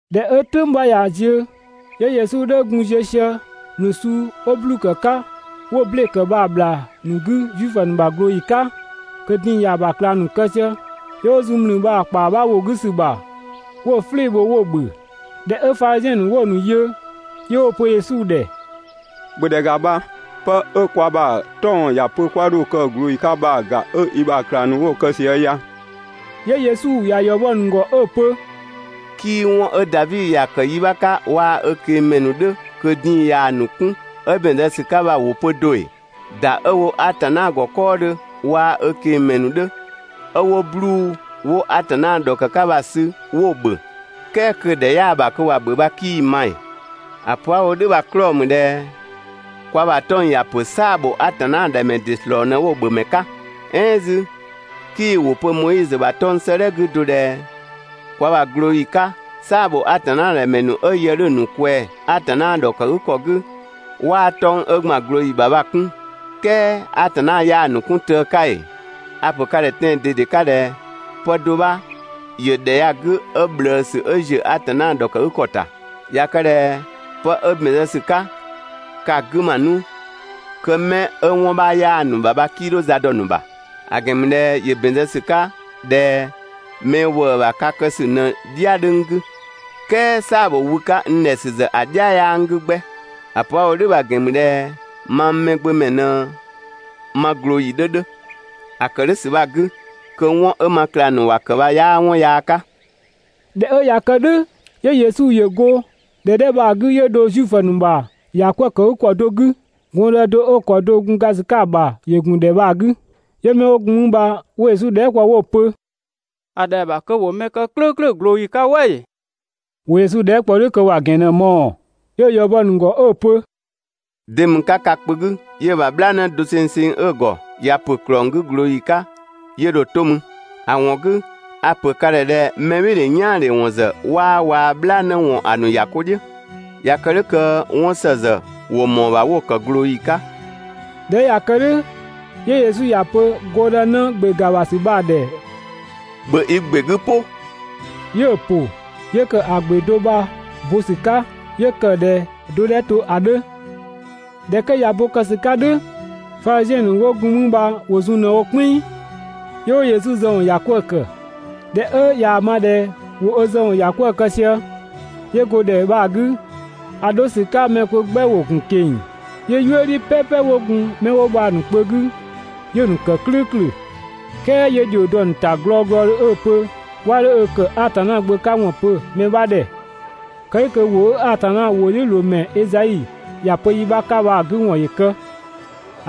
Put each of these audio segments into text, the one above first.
꞊Dhɛ 'ö "tʋ̈ng 'bha ꞊ya ziö, 'yö Yesu 'dhö gun ziö sië ‑mlü suu 'wo 'bluu‑ ‑kë 'ka 'wo‑ ble ‑kë bha‑ ‑bhlaa ‑nu 'gü Zuifö ‑nu ꞊glooyi 'ka kö din‑ ‑ya ‑bha ꞊klang ‑nu kë sië, 'yö 'wo zun ‑mlü bha‑ ‑kpaa 'bha ‑wo 'gü ‑sü ‑bha 'wo‑ "flɩɩ‑ bho 'wo‑ ‑bhö. ꞊Dhɛ 'ö Fadhiziɛn ‑nu 'wo‑ ‑nu yö, 'yö 'wo‑ pö Yesu ‑dhɛ: «‑Bhö ‑dhɛ ‑ga bha, pë 'ö kwa ‑bha 'tɔng‑ ‑ya pö 'kwa 'dho‑ kë ꞊glooyi 'ka bha‑ ‑ga 'ö i ‑bha ꞊klang ‑nu 'wo‑ kë sië ya!» 'Yö Yesu ‑ya ‑yɔ bɔ‑ ‑nu ‑gɔ 'ö‑ pö: «'Kii 'wɔn 'ö Davi ‑ya kë yi 'bha 'ka waa‑ ö ꞊keng‑ ‑mɛ ‑nu 'dhö kö din‑ ꞊yaa‑ ‑nu 'kun 'ö ‑bɛn zë ‑sü 'ka bha‑ ‑wʋ pö do ‑ee? ‑Da 'ö‑ wo Atanna ‑gɔ 'kɔɔdhö waa‑ ö ꞊keng‑ ‑mɛ ‑nu 'dhö, ('ö 'wo 'bluu‑ 'wo Atanna ‑dhɔkë 'ka bha‑) sü 'wo‑ ‑bhö, "kɛɛ kö‑ ‑dhɛ 'yaa‑ ‑bha kö ‑wa ‑bhö bha, 'kii‑ ma ‑ee? ‑A pö 'a‑ wo "dhʋ̈ bha‑ 'klɔɔ‑ ‑mü ꞊dhɛ kwa ‑bha 'tɔng‑ ‑ya ‑pö "saa‑ ‑bho Atanna ‑dhɛ ‑mɛ ‑nu ‑dɩ ‑slɔɔ ꞊në 'wo‑ ‑bhö ‑mɛ 'ka. "Ɛɛn 'zü, 'kii‑ ‑wʋ pö Moizö ‑bha 'tɔng‑ 'sëëdhɛ 'gü do ꞊dhɛ kwa ‑bha ꞊glooyi 'ka "saa‑ ‑bho Atanna ‑dhɛ ‑mɛ ‑nu 'ö yë 'dhö‑ ‑nu ꞊kwɛɛ‑ Atanna ‑dhɔkëgükɔ 'gü, 'waa 'tɔng‑ 'ö ‑gban ꞊glooyi ‑bha bha‑ 'kun, "kɛɛ Atanna 'yaa‑ ‑nu 'kun tëë 'ka ‑ee? A‑ ‑pö ka ‑dhɛ tɛan‑ ꞊dede 'ka ꞊dhɛ: Pë do 'bha ‑yö ‑dhɛ ya‑ 'gü 'ö ꞊bhlëësü 'ö ‑ziö Atanna ‑dhɔkëgükɔ ‑ta. ꞊Ya kë ꞊dhɛ pë 'ö ‑bɛn zë ‑sü 'ka, ka‑ 'gü ‑ma 'nu kö 'mɛ 'ö 'wɔn 'bha 'yaa‑ ‑nu ‑bha bha, 'kii 'dho za dɔ‑ ‑nu ‑bha. ‑A ‑gɛn ‑mü ꞊dhɛ ‑yö ‑bɛn zë ‑sü 'ka ꞊dhɛ mɛ ‑wëë ‑bha ka kë ‑sü ꞊në‑ "dhia 'dhö n 'gü, "kɛɛ "saa‑ ‑bho wü 'ka n ‑dhɛ ‑sü ‑zë ‑a "dhia 'yaa n 'gü 'gbɛ. ‑A pö 'a‑ wo "dhʋ̈ bha‑ ‑gɛn ‑mü ꞊dhɛ mang Mɛgbömɛ ꞊në ma ꞊glooyi 'dhö 'dhö. (‑A ‑kë "dhʋ̈ ‑sü bha‑ 'gü kö 'wɔn 'ö ma ꞊klang ‑nu ‑wa ‑kë bha 'yaa 'wɔn yaa 'ka.)» ꞊Dhɛ 'ö ꞊ya kë "dhʋ̈, 'yö Yesu ‑yö go ‑dhɛ 'dhɛ bha‑ 'gü 'yö dho Zuifö ‑nu ‑bha ‑yakwëëkëgükɔ do 'gü. Gɔndë do 'ö‑ ‑kɔ do‑ gun ga ‑sü 'ka‑ ‑bha ‑yö ‑gun ‑dhɛ bha‑ 'gü, 'yö 'mɛ 'wo gun mü bha 'wo Yesu dhɛɛ" kpɔ 'wo‑ pö: «‑A ‑dhɛa ‑bha kö ‑wo mɛ kë "klʋ̈ʋ̈klʋ̈ ꞊glooyi 'ka "wɛ ‑ee?» ‑Wo Yesu dhɛɛ" ‑kpɔ "dhʋ̈ kö ‑wa ‑gɛn ꞊në‑ mɔɔ‑. 'Yö‑ ‑ya ‑yɔ bɔ‑ ‑nu ‑gɔ 'ö‑ pö: «De ‑mü 'ka ka kpö 'gü 'yö‑ ‑bha "bhlaanë dosengseng 'ö‑ ‑gɔ, ꞊ya ‑pö ‑klɔng 'gü ꞊glooyi 'ka 'yö dho‑ 'to mü? ‑A ‑wɔn 'gü a‑ ‑pö ka ‑dhɛ ꞊dhɛ mɛbhɩɩdhe "yaandhe ‑wɔn ‑zë 'waa waa‑ "bhlaanë ‑wɔn ‑a ‑nu ‑ya 'ko "dhiʋ̈. ꞊Ya kë "dhʋ̈ kö 'wɔn ‑së ‑zë ‑wo ‑mɔɔ ‑bha 'wo‑ ‑kë ꞊glooyi 'ka.» ꞊Dhɛ 'ö ꞊ya kë "dhʋ̈ 'yö Yesu ‑ya pö gɔndënë ‑gbe ‑ga ‑bha ‑sü bha‑ ‑dhɛ: «‑Bhö i ‑gbe 'gü "pʋ!» 'Yö‑ ‑pʋ, 'yö ‑kë ‑a ‑gbe do bha‑ bo ‑sü 'ka 'yö ‑kë ꞊dhɛ‑ do 'dhɛ to ‑a 'dhö. ꞊Dhɛ 'kö ꞊ya bo‑ kë ‑sü 'ka "dhʋ̈, Fadhiziɛn ‑nu 'wo gun mü bha ‑wo zun ꞊në‑ wo "kpɛnng, 'yö 'wo Yesu zë ‑wɔn ‑yakwëë ‑kë. ꞊Dhɛ 'ö ꞊yaa‑ ma ꞊dhɛ ‑wo ö zë ‑wɔn ‑ya 'kwëë‑ kë sië, 'yö go ‑dhɛ bha‑ 'gü. ‑A 'dho ‑sü 'ka mɛ kpö 'gbɛ ‑wo ‑gun ꞊keng‑. 'Yö "yuëdhi "pɛpɛ 'wo gun 'mɛ 'wo bha‑ ‑nu kpö 'gü, 'yö‑ ‑nu ‑kë "klʋ̈ʋ̈klʋ̈. "Kɛɛ 'yö ‑dhio dɔ‑ ‑nu ‑ta glɔɔglɔdhö 'ö‑ pö 'wa 'dho ö ‑kë Atanna Gbö 'ka ‑wɔn pö mɛ 'bha ‑dhɛ. Kë "dhʋ̈ kö ‑wʋ 'ö Atanna ‑wʋdhiʋ̈loomɛ Ezai ‑ya pö yi 'bha 'ka bha‑ 'gü ‑wɔn ‑yö kë;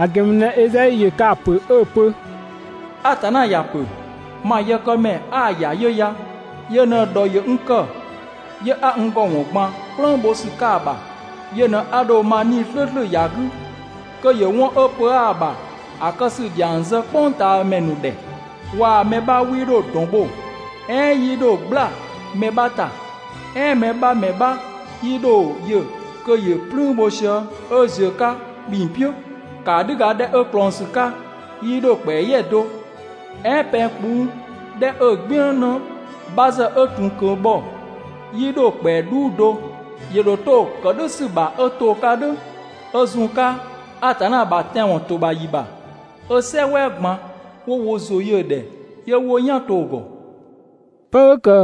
‑a ‑gɛn ‑mü ꞊dhɛ Ezai ‑yö ka‑ ‑pö 'ö‑ pö: Atanna ‑ya ‑pö: Ma yëkëmɛ 'a‑ ‑ya 'yö ya, Yö ꞊në‑ ‑dhɔ ‑yö n ‑kë, 'yö 'a n ‑gɔ ‑wɔn ꞊gban "kplëng bho ‑sü 'ka i ‑bha. Yö ꞊në 'a ‑dho ma 'Nii‑ "slʋ̈ʋ̈slʋ̈ ‑ya 'gü kö ‑yö 'wɔn 'ö pö 'aa‑ ‑bha ‑a kë ‑sü ‑dhiang zë "kpʋngtaamɛ ‑nu ‑dhɛ. Waa‑ mɛ 'bha 'wii 'dho ‑dɔn bho, "ɛɛn 'yii 'dho "gbla mɛ 'bha ‑ta, "ɛɛn mɛ 'bha ‑mɛ 'bha 'yii 'dho‑ yö kö ‑yö "plüün bho sië 'ö ꞊ziö‑ 'ka ‑kpinng "piʋ̈. ‑Kaadhüga 'dhɛ 'ö ꞊klɔngsü 'ka 'yii 'dho‑ ‑kpɛa "yɛ do, "ɛɛn pɛng kpuu' 'dhɛ 'ö‑ "gbiën 'në 'bha ‑zë 'ö ‑tun kö bhɔ, 'yii 'dho‑ ‑kpɛa "dhuu do. ‑Yö ‑dho 'to‑ ‑kë "dhʋ̈ ‑sü ‑bha 'ö to‑ 'ka "dhʋ̈, 'ö zun‑ 'ka Atanna ‑bha tɛanwɔn ‑to ‑bha ‑yi ‑bha, 'ö "sɛ "wɛɛ ꞊gban 'wo wo ‑zʋ yö‑ ‑dhɛ 'yö 'wo "yan to‑ ‑gɔ.» ('Pë 'ö ‑kë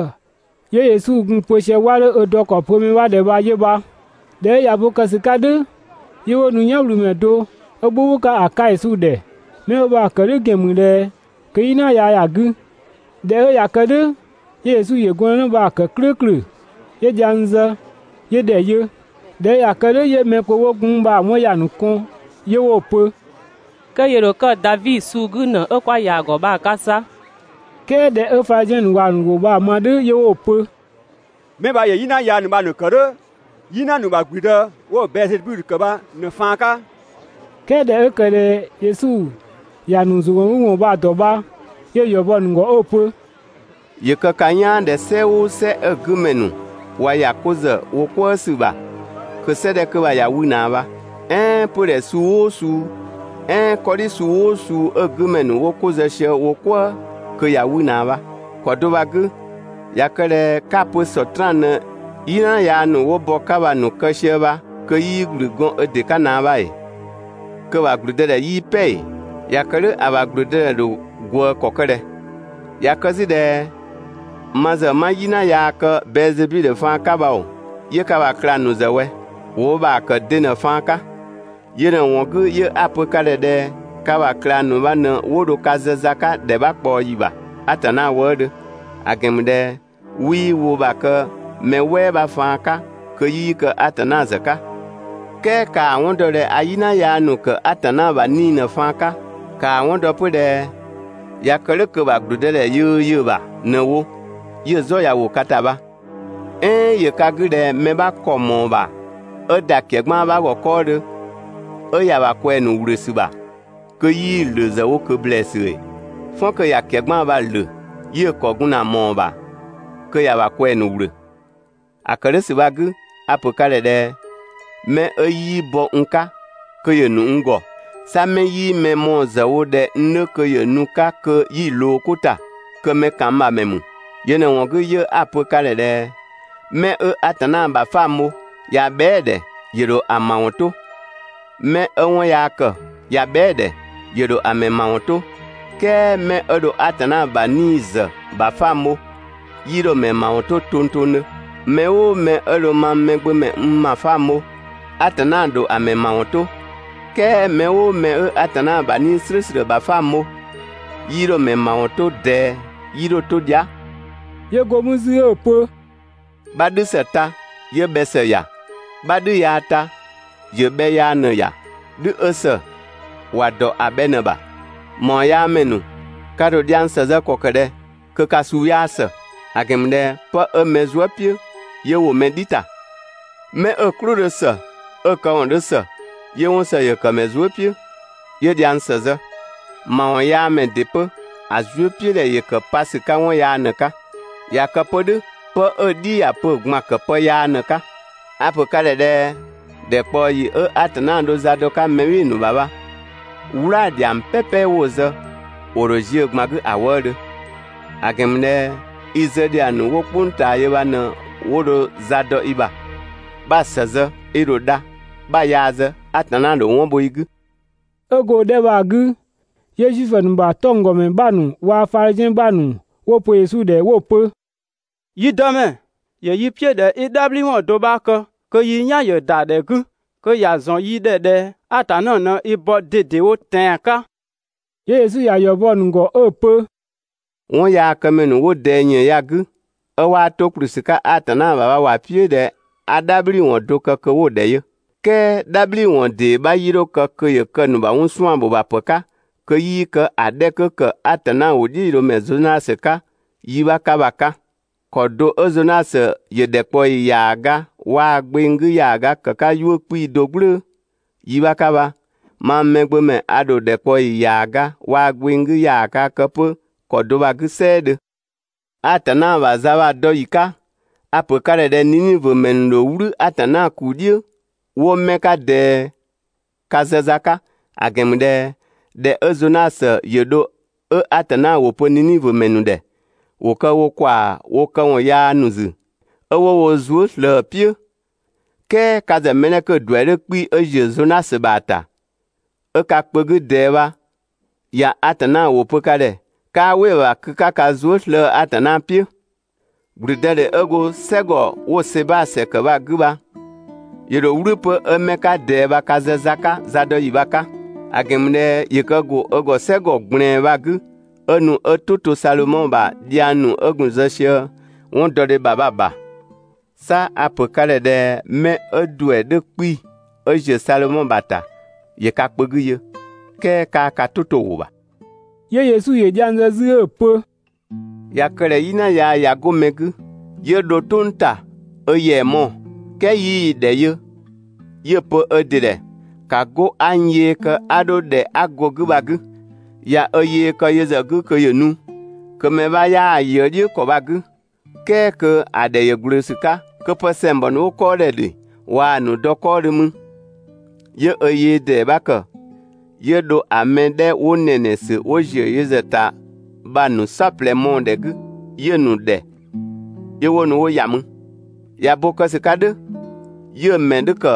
'yö Yesu gun‑ pö sië 'wa 'dho ö dɔ ‑kɔ pö mɛ 'bha ‑dhɛ bha 'yö bha.) ꞊Dhɛ 'ö ꞊ya bo ‑kë ‑sü 'ka "dhʋ̈, 'yö 'wo nu "yanwlümɛ do 'ö "bhʋbhʋ 'ka ‑a 'ka Yesu ‑dhɛ. 'Mɛ 'ö bha‑ kë "dhʋ̈ ‑gɛn ‑mü ꞊dhɛ kö "yina yaa ‑ya 'gü. ꞊Dhɛ 'ö ꞊ya kë "dhʋ̈, 'yö Yesu ‑yö gɔndënë bha‑ ‑kë "klʋ̈ʋ̈klʋ̈, 'yö dhiang zë, 'yö ‑dhɛ yö. ꞊Dhɛ 'ö ꞊ya kë "dhʋ̈ 'yö mɛ kpö 'wo gun 'mü bha‑ 'wɔn ‑ya ‑nu kɔn 'yö 'wo‑ pö: «Kö ‑yö ‑dho kë Davi suu 'gü ‑në 'ö 'kwa ‑ya ‑gɔ bha‑ 'ka 'sa.» "Kɛɛ ꞊dhɛ 'ö Fadhiziɛn ‑nu ‑wa ‑nu ‑wʋ bha‑ ma "dhʋ̈ 'yö 'wo‑ pö: «'Mɛ bha ‑yö "yina yaa ‑nu bha‑ ‑nu ‑kë "dhʋ̈ "yina ‑nu ‑bha ‑gblüdë 'wo‑ Bɛɛzebidhö ‑kë bha ꞊në‑ faan 'ka.» "Kɛɛ ꞊dhɛ 'ö ‑kë ꞊dhɛ Yesu ‑ya ‑nu ‑zʋgɔngüwɔn ‑nu bha‑ ‑dɔ bha, 'yö‑ ‑yɔ bɔ‑ ‑nu ‑gɔ 'ö‑ pö: «‑Yö kë ka "yaan ꞊dhɛ "sɛ "ʋʋ "sɛ 'ö‑ 'gü ‑mɛ ‑nu ꞊wa ‑ya 'ko ‑zë wo "kwëë ‑sü ‑bha kö "sɛ 'dhɛ 'kö bha ꞊ya 'wü ꞊naa bha. "Ɛɛn 'pödhɛ suu "ʋʋ suu "ɛɛn 'kɔdhi suu "ʋʋ suu 'ö‑ 'gü ‑mɛ ‑nu 'wo 'ko zë sië wo "kwëë kö ꞊ya 'wü ꞊naa bha. ‑Kɔ do bha‑ 'gü, ꞊ya kë ꞊dhɛ 'ka‑ pö Sɔtraan ꞊në "yina yaa ‑nu 'wo bɔ‑ 'ka bha‑ ‑nu kë sië bha kö 'yii ‑gblü gɔɔn ö ‑dɩ 'ka ꞊naa bha ‑ee? Kö‑ ‑bha ‑gblüdëdhɛ 'yii "pɛ ‑ee? ꞊Ya kë "dhʋ̈ ‑a ‑bha ‑gblüdëdhɛ ‑dho ꞊gwëë ‑kɔ ‑kë ꞊dhɛ? ꞊Ya kë 'zü ꞊dhɛ ma ‑zë 'ma "yina yaa kë Bɛɛzebidhö faan 'ka bha ‑oo, 'yö ka ‑bha ꞊klang ‑nu ‑zë ꞊wɛ? ‑Wo wo ‑bha ‑kë de ꞊në‑ faan 'ka? Yö ꞊në‑ ‑wɔn 'gü 'yö 'a‑ pö ka ‑dhɛ ꞊dhɛ ka ‑bha ꞊klang ‑nu bha ꞊në 'wo dho ka zë za 'ka ‑dhɛ 'bha ꞊kpaɔ ‑yi ‑bha (Atanna wëëdhö, ‑a ‑gɛn ‑mü ꞊dhɛ 'wii wo ‑bha bha‑ kë mɛ "wɛɛ 'bha faan 'ka kö 'yii kë Atanna ‑zë 'ka). "Kɛɛ ‑kaa 'wɔn dɔ ꞊dhɛ a "yina yaa ‑nu ‑kë Atanna ‑bha 'Nii‑ ꞊në‑ faan 'ka, ‑Kaa 'wɔn dɔ 'pö ꞊dhɛ ꞊ya kë "dhʋ̈ kö‑ ‑bha ‑gblüdëdhɛ yöö yö‑ ‑bha ꞊në‑ wo, 'yö‑ "zɔ ꞊ya ‑wo ka ‑ta bha. "Ɛɛn ‑yö ka 'gü ꞊dhɛ mɛ 'bha ‑kɔ ‑mɔɔ ‑bha 'ö ‑da ‑kɛgbaan 'bha ‑gɔ 'kɔɔdhö 'ö ‑ya ‑bha ꞊kwɛɛ‑ ‑nu ‑wlösü ‑bha kö 'yii‑ ‑lö ‑zë wo ꞊kö ‑blɛɛsü ‑ee? "Fɔn kö ꞊ya ‑kɛgbaan bha‑ ‑lö, 'yö‑ ‑kɔ gun ‑na ꞊mɔɔ‑ ‑bha kö ‑ya ‑bha ꞊kwɛɛ‑ ‑nu ‑wlö. ‑A ‑kë "dhʋ̈ ‑sü bha‑ 'gü a‑ ‑pö ka ‑dhɛ ꞊dhɛ: 'Mɛ 'ö 'yii bɔ n 'ka kö ‑yö ‑nu n ‑gɔ. 'Sa 'mɛ 'yii mɛ mɔɔ‑ ‑zë wo ꞊dhɛ n 'dhö kö ‑yö nu‑ 'ka kö 'yi‑ ꞊loo 'ko ‑ta, kö mɛ ‑kan n ‑bha ‑mɛ ‑mü. Yö ꞊në‑ ‑wɔn 'gü 'yö 'a‑ pö ka ‑dhɛ ꞊dhɛ: 'Mɛ 'ö Atanna ‑bha 'fang bho, (꞊ya bhɛa"‑ ‑dhɛ) ‑yö ‑dho ‑a ‑mawɔn 'to, 'mɛ 'ö 'wɔn yaa ‑kë, (꞊ya bhɛa"‑ ‑dhɛ) ‑yö ‑dho ‑a ‑mɛ ‑mawɔn 'to, "kɛɛ 'mɛ 'ö dho Atanna ‑bha 'Nii‑ ‑zë ‑bha 'fang bho, 'yii 'dho‑ ‑mɛ ‑mawɔn 'to tongtongdhö. Mɛ "ʋʋ mɛ 'ö dho mang Mɛgbömɛ n ‑bha 'fang bho, Atanna ‑dho ‑a ‑mɛ ‑mawɔn 'to, "kɛɛ mɛ "ʋʋ mɛ 'ö Atanna ‑bha 'Nii‑ "slʋ̈ʋ̈slʋ̈ ‑bha 'fang bho, 'yii 'dho‑ ‑mɛ ‑mawɔn 'to ꞊dɛɛ, 'yii 'dho‑ 'to dhia".» 'Yö go mü 'zü 'ö‑ pö: «'Bha "dhü ‑së ta 'yö bhɛ ‑së ‑ya, 'bha "dhü yaa ta ‑yö bhɛ yaa ꞊në‑ ‑ya. "Dhü 'ö ‑së ‑wa ‑dɔ ‑a bhɛ ꞊në‑ ‑bha. ‑Mawɔnyaamɛ ‑nu, ka ‑dho dhiang ‑së zë ‑kɔ ‑kë ꞊dhɛ kö ka suu 'yaa ‑së. ‑A ‑gɛn ‑mü ꞊dhɛ 'pë 'ö mɛ zuë" "piʋ̈, 'yö ‑wo mɛ "dhi ‑ta. 'Mɛ 'ö‑ "klʋ 'dhö ‑së, 'ö‑ këwɔn 'dhö ‑së 'yö 'wɔn ‑së ‑yö ‑kë ‑mɛ zuë" "piʋ̈, 'yö dhiang ‑së zë. ‑Mawɔnyaamɛ ‑dɩ 'pö, ‑a zuëpiʋ̈dhɛ ‑yö kë pa ‑sü 'ka 'wɔn yaa ꞊në‑ 'ka. ꞊Ya kë 'pö "dhʋ̈ pë 'ö‑ "dhi ‑ya pö‑ ꞊gbaan ‑kë pë yaa ꞊në‑ 'ka. A‑ ‑pö ka ‑dhɛ ꞊dhɛ: ‑Dhɛkpaɔyi 'ö Atanna dho za dɔ‑ 'ka mɛ "bhɩɩ‑ ‑bha bha, "wlaa‑ ‑dhiang "pɛpɛ 'wo‑ zë, ‑wo ‑dho ziö‑ ꞊gban 'gü ‑a wëëdhö. ‑A ‑gɛn ‑mü ꞊dhɛ i zë ‑dhiang ‑nu 'wo "kpʋng ꞊taa yö bha ꞊në 'wo dho za dɔ i ‑bha. 'Bha‑ ‑së zë i ‑dho dha, 'bha‑ yaa zë, Atanna ‑dho 'wɔn bho i 'gü. 'Ö go‑ 'dhɛ bha‑ 'gü, 'yö Zuifö ‑nu ‑bha 'tɔnggɔmɛ ‑nu 'bha ‑nu waa‑ Fadhiziɛn ‑nu 'bha ‑nu 'wo‑ pö Yesu ‑dhɛ 'wo‑ pö: «Yi Dëmɛ, ‑yö yi "piʋ̈ ꞊dhɛ 'i "dhabhliwɔn do 'bha kë kö yi "yan ‑yö ‑da ‑dhɛ 'gü (kö ‑ya ‑zɔn yi ‑dhɛ ꞊dhɛ Atanna ꞊në i bɔ ꞊dedewo tɛan‑ 'ka)!» 'Yö Yesu ‑ya ‑yɔ bɔ‑ ‑nu ‑gɔ 'ö‑ pö: «'Wɔnyaakëmɛ ‑nu 'wo ꞊dɛɛ ‑yën ya‑ 'gü, 'ö 'waa 'to ‑kplü ‑sü 'ka Atanna ‑bha bha ‑wa "piʋ̈ ꞊dhɛ 'a "dhabhliwɔn do kë kö 'wo‑ ‑dhɛ yö, "kɛɛ "dhabhliwɔn ‑dee 'bha 'yii 'dho kë kö ‑yö kë ‑a ‑nu ‑bha 'wɔn 'suan‑ ‑bho ‑bha pë 'ka kö 'yii kë ‑a 'dhɛ 'kö ‑kë Atanna ‑wʋdhiʋ̈loomɛ Zonasö 'ka yi 'bha 'ka bha‑ 'ka. ‑Kɔ do 'ö Zonasö ‑yö ‑dhɛkpaɔyi ‑yaaga waa‑ gbeng 'gü ‑yaaga ‑kë 'ka 'yuʋ̈‑ 'kpii‑ do "gblʋ̈ʋ̈‑ yi 'bha 'ka bha, mang Mɛgbömɛ a ‑dho ‑dhɛkpaɔyi ‑yaaga waa‑ gbeng 'gü ‑yaaga kë 'pö ‑kɔ do bha‑ 'gü "sɛɛdhö. Atanna ‑bha za bha‑ dɔ ‑yi 'ka, a‑ ‑pö ka ‑dhɛ ꞊dhɛ Ninivö ‑mɛ ‑nu ‑dho "wlü Atanna ‑kuu "dhiʋ̈ 'wo 'mɛ 'ka ꞊dɛɛ ka zë za 'ka, ‑a ‑gɛn ‑mü ꞊dhɛ ꞊dhɛ 'ö Zonasö ‑yö dho 'ö Atanna ‑wʋ pö Ninivö ‑mɛ ‑nu ‑dhɛ, ‑wo kë wo kwaa‑ wo këwɔn yaya ‑nu ‑zü, 'ö 'wo wo zuë" ꞊slëë‑ "piʋ̈, "kɛɛ ka ‑zë mɛ 'dhɛ 'kö‑ ‑duɛ 'dhö 'kpii‑ 'ö ‑ziö Zonasö ‑bha ‑ta, 'ö ka kpö 'gü ꞊dɛɛ bha ꞊ya Atanna ‑wʋ pö ka ‑dhɛ, 'kaa "wɩ‑ ‑bha kö 'ka ka zuë" slëë‑ Atanna "piʋ̈. ‑Gblüdëdhe 'ö go "sɛgɔ 'wo‑ Seba ‑sɛ ‑kë bha‑ 'gü bha ‑yö ‑dho "wlü 'pö 'ö 'mɛ 'ka ꞊dɛɛ bha ka zë za 'ka zadɔyi bha‑ 'ka. ‑A ‑gɛn ‑mü ꞊dhɛ ‑yö kë ‑go ö ‑gɔ "sɛgɔ ꞊gblɛɛn bha‑ 'gü, 'ö nu 'ö "tʋ to Sadhomɔ ‑bha dhiang ‑nu 'ö gun‑ zë sië 'wɔndɔdhe ‑bha bha‑ ‑bha. 'Sa a‑ ‑pö ka ‑dhɛ ꞊dhɛ 'mɛ 'ö‑ ‑duɛ 'dhö 'kpii‑ 'ö ‑ziö Sadhomɔ ‑bha ‑ta, ‑yö ka kpö 'gü yö, "kɛɛ 'kaa ka "tʋ 'to‑ ‑wʋ ‑bha.» 'Yö Yesu ‑yö dhiang zë 'zü 'ö‑ pö: «꞊Ya kë ꞊dhɛ "yina yaa ꞊ya 'go mɛ 'gü, 'yö dho "tʋng ‑ta ö ‑yɛa mɔɔ‑, "kɛɛ 'yii‑ ‑dhɛ yö 'yö‑ pö ö ‑dɩ ꞊dhɛ: ‹‑Ka 'go 'a n yee kë 'a 'dho ‑dhɛ 'a go‑ 'gü bha‑ 'gü.› ꞊Ya ö yee kë yö ‑zë 'gü kö ‑yö nu kö mɛ 'bha 'yaa‑ ꞊yëë "dhiʋ̈ ‑kɔ bha‑ 'gü, "kɛɛ kö ‑a ‑dhɛ ‑yö ‑gblö ‑sü 'ka, kö pë ‑sɛngbɔ ‑nu 'wo 'kɔɔ ‑dhɛ ‑dhi waa‑ ‑nu dɔ 'kɔɔdhö 'mü, 'yö ö yee ‑dee 'bha ‑kë 'yö dho ‑a mɛ 'dhɛ 'wo ‑nɛnɛsü 'wo ‑ziö yö ‑zë ‑ta bha‑ ‑nu "saɔplɛ mɔɔ‑ ‑dhɛ 'gü 'yö‑ ‑nu ‑dhɛ 'yö 'wo nu 'wo ‑ya mü. ꞊Ya bo kë ‑sü 'ka "dhʋ̈ 'yö‑ ‑mɛ 'dhö ‑kë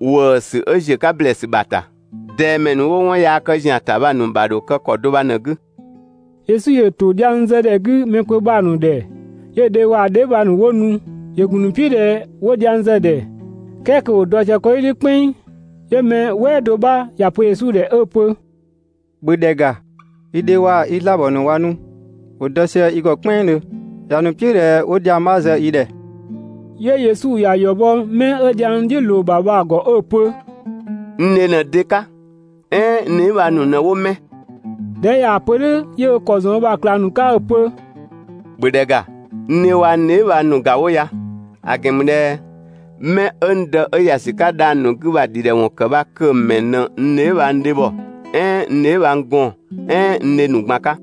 ‑wëësü 'ö ‑ziö 'ka ‑blɛɛsü ‑bha ‑ta. ꞊Dɛɛ ‑mɛ ‑nu 'wo 'wɔn yaa kë ‑zian ‑ta bha‑ ‑nu ‑bha ‑dho kë ‑kɔ do bha ꞊në‑ 'gü. Yesu ‑yö ‑to dhiang zë ‑dhɛ 'gü mɛ kpö bha‑ ‑nu ‑dhɛ, 'yö‑ dhe waa‑ dheebhang ‑nu 'wo nu. ‑Yö ‑gun ‑nu "piʋ̈ ꞊dhɛ 'wo dhiang zë‑ ‑dhɛ, "kɛɛ kö ‑wo dɔ sië 'kɔdhi "dhiʋ̈ "kpɛnng. 'Yö mɛ "wɛɛ do 'bha ‑ya pö Yesu ‑dhɛ 'ö‑ pö: «‑Bhö ‑dhɛ ‑ga, i dhe waa‑ i 'zlaabɔ ‑nu ꞊wa nu, ‑wo dɔ sië i ‑gɔ "kpɛnngdhö, ‑ya ‑nu "piʋ̈ ꞊dhɛ 'wo dhiang 'bha zë i ‑dhɛ.» 'Yö Yesu ‑ya ‑yɔ bɔ 'mɛ 'ö dhiang "dhiʋ̈ ꞊loo‑ ‑bha bha‑ ‑gɔ 'ö‑ pö: «N dhe ꞊në de 'ka? "Ɛɛn n dheebhang ‑nu ꞊në 'wo 'mɛ?» ꞊Dhɛ 'ö ꞊yaa‑ pö "dhʋ̈, 'yö ö ‑kɔ ‑zɔn ö ‑bha ꞊klang ‑nu 'ka 'ö‑ pö: «‑Bhö ‑dhɛ ‑ga, n dhe waa‑ n dheebhang ‑nu ‑ga 'wo ya! ‑A ‑gɛn ‑mü ꞊dhɛ 'mɛ 'ö n Dë 'ö ‑ya ‑sü 'ka dhang‑ ‑nu 'gü bha‑ ‑dhidhɛwɔn ‑kë bha kö‑ ‑mɛ ꞊në n dheebhang dhebhɔ, "ɛɛn n dheebhang gɔɔn‑ "ɛɛn n dhe ‑nu ꞊gban 'ka.